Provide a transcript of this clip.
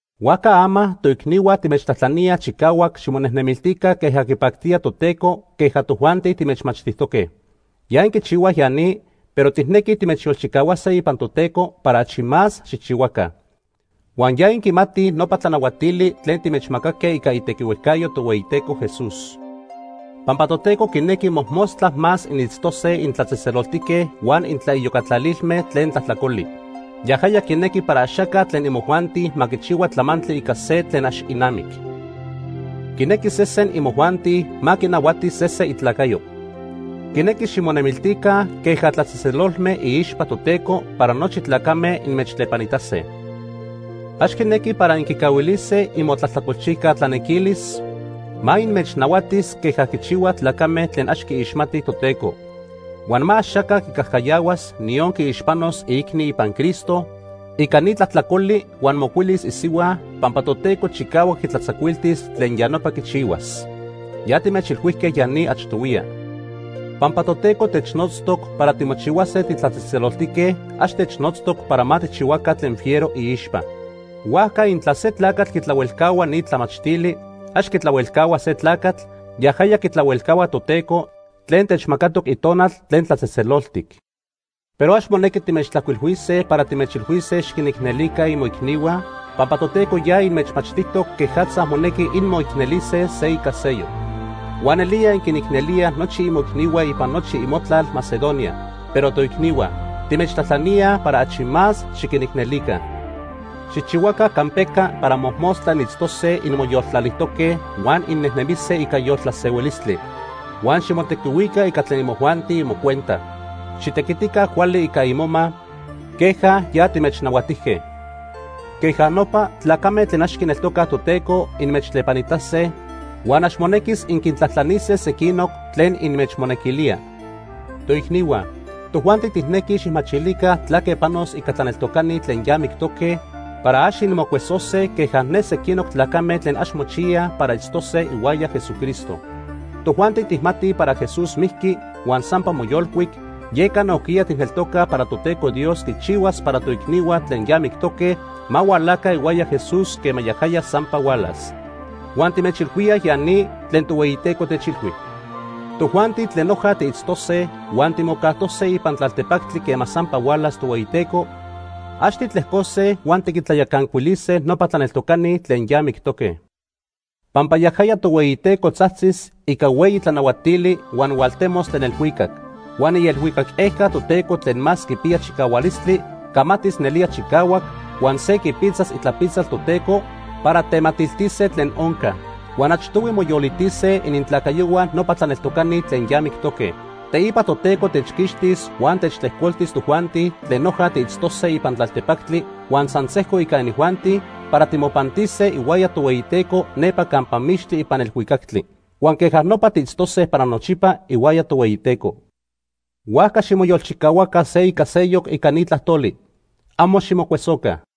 Huajca ama, toicnihua timechtlajtlaníaj chicahuac ximonejnemiltica queja quipactía Toteco queja tojuanti timechmachtijtoque. Ya inquichihuaj ya ni, pero tijnequij timechyolchicahuase ipan Toteco para achi más xijchihuaca. Huan ya inquimatij nopa tlanahuatili tlen timechmacaque ica itequihuejcayo Tohueyiteco Jesús. Pampa Toteco quinequi mojmostla más initztose intlatzejtzeloltique huan intlaiyocatlalilme tlen tlajtlacoli. Yajaya quinequi para axaca tlen imojuanti ma quichihua tlamantli ica se tlen ax inamic. Quinequi sesen imojuanti ma quinahuati sese itlacayo. Quinequi ximonemiltica queja tlatzejtzelolme iixpa Toteco para nochi tlacame inmechtlepanitase. Ax quinequi para inquicahuilise inmotlajtlacolchijca tlanequilis ma inmechnahuatis queja quichihuaj tlacame tlen ax quiixmatij Toteco. Huan ma axaca quicajcayahuas, niyon quiixpanos, iicni ipan Cristo ica ni tlajtlacoli huan mocuilis isihua, pampa Toteco chicahuac quitlatzacuiltis tlen ya nopa quichihuas. Ya timechilhuijque ya ni achtohuiya. Pampa Toteco technotztoc para timochihuase titlatzejtzeloltique, ax technotztoc para ma tijchihuaca tlen fiero iixpa. Huajca intla se tlacatl quitlahuelcahua ni tlamachtili, ax quitlahuelcahua se tlacatl; yajaya quitlahuelcahua Toteco tlen techmacatoc Itonal tlen tlatzejtzeloltic. Pero ax monequi timechtlajcuilhuise para timechilhuise xiquinicnelica imoicnihua, pampa Toteco ya inmechmachtijtoc quejatza monequi inmoicnelise se ica seyoc. Huan nelía inquinicnelíaj nochi imoicnihua ipan nochi imotlal Macedonia. Pero toicnihua, timechtlajtlaníaj para achi más xiquinicnelica. Xijchihuaca campeca para mojmostla initztose inmoyoltlalijtoque huan innejnemise ica yoltlasehuilistli. Huan ximotequihuica ica tlen imojuanti imocuenta. Xitequitica cuali ica imoma queja ya timechnahuatijque. Queja nopa tlacame tlen ax quineltocaj Toteco inmechtlepanitase, huan ax monequis inquintlajtlanise sequinoc tlen inmechmonequilía. Toicnihua, tojuanti tijnequij xijmachilica tlaque panos ica tlaneltocani tlen ya mictoque para ax inmocuesose queja ne sequinoc tlacame tlen ax mochiyaj para itztose ihuaya Jesucristo. Tojuanti tijmatij para Jesús mijqui huan sampa moyolcuic, yeca nojquiya tijneltocaj para Toteco Dios quichihuas para toicnihua tlen ya mictoque ma hualaca ihuaya Jesús quema yajaya sampa hualas. Huan timechilhuíaj ya ni tlen Tohueyiteco techilhui. Tojuanti tlen noja tiitztose huan timocajtose ipan tlaltepactli quema sampa hualas Tohueyiteco, ax titlejcose huan tiquintlayacancuilise nopa tlaneltocani tlen ya mictoque. Pampa yajaya Tohueyiteco tzajtzis ica hueyi tlanahuatili huan hualtemos tlen elhuicac. Huan ielhuicac ejca Toteco tlen más quipiya chicahualistli camatis nelía chicahuac huan se quipitzas itlapitzal Toteco para tematiltise tlen onca. Huan achtohui moyolitise inintlacayohua nopa tlaneltocani tlen ya mictoque. Teipa Toteco techquixtis huan techtlejcoltis tojuanti tlen noja tiitztose ipan tlaltepactli huan san sejco ica inijuanti para timopantise ihuaya Tohueyiteco nepa campa mixtli ipan elhuicactli. Huan queja nopa tiitztose para nochipa ihuaya Tohueyiteco. Huajca ximoyolchicahuaca se ica seyoc ica ni tlajtoli. Amo ximocuesoca.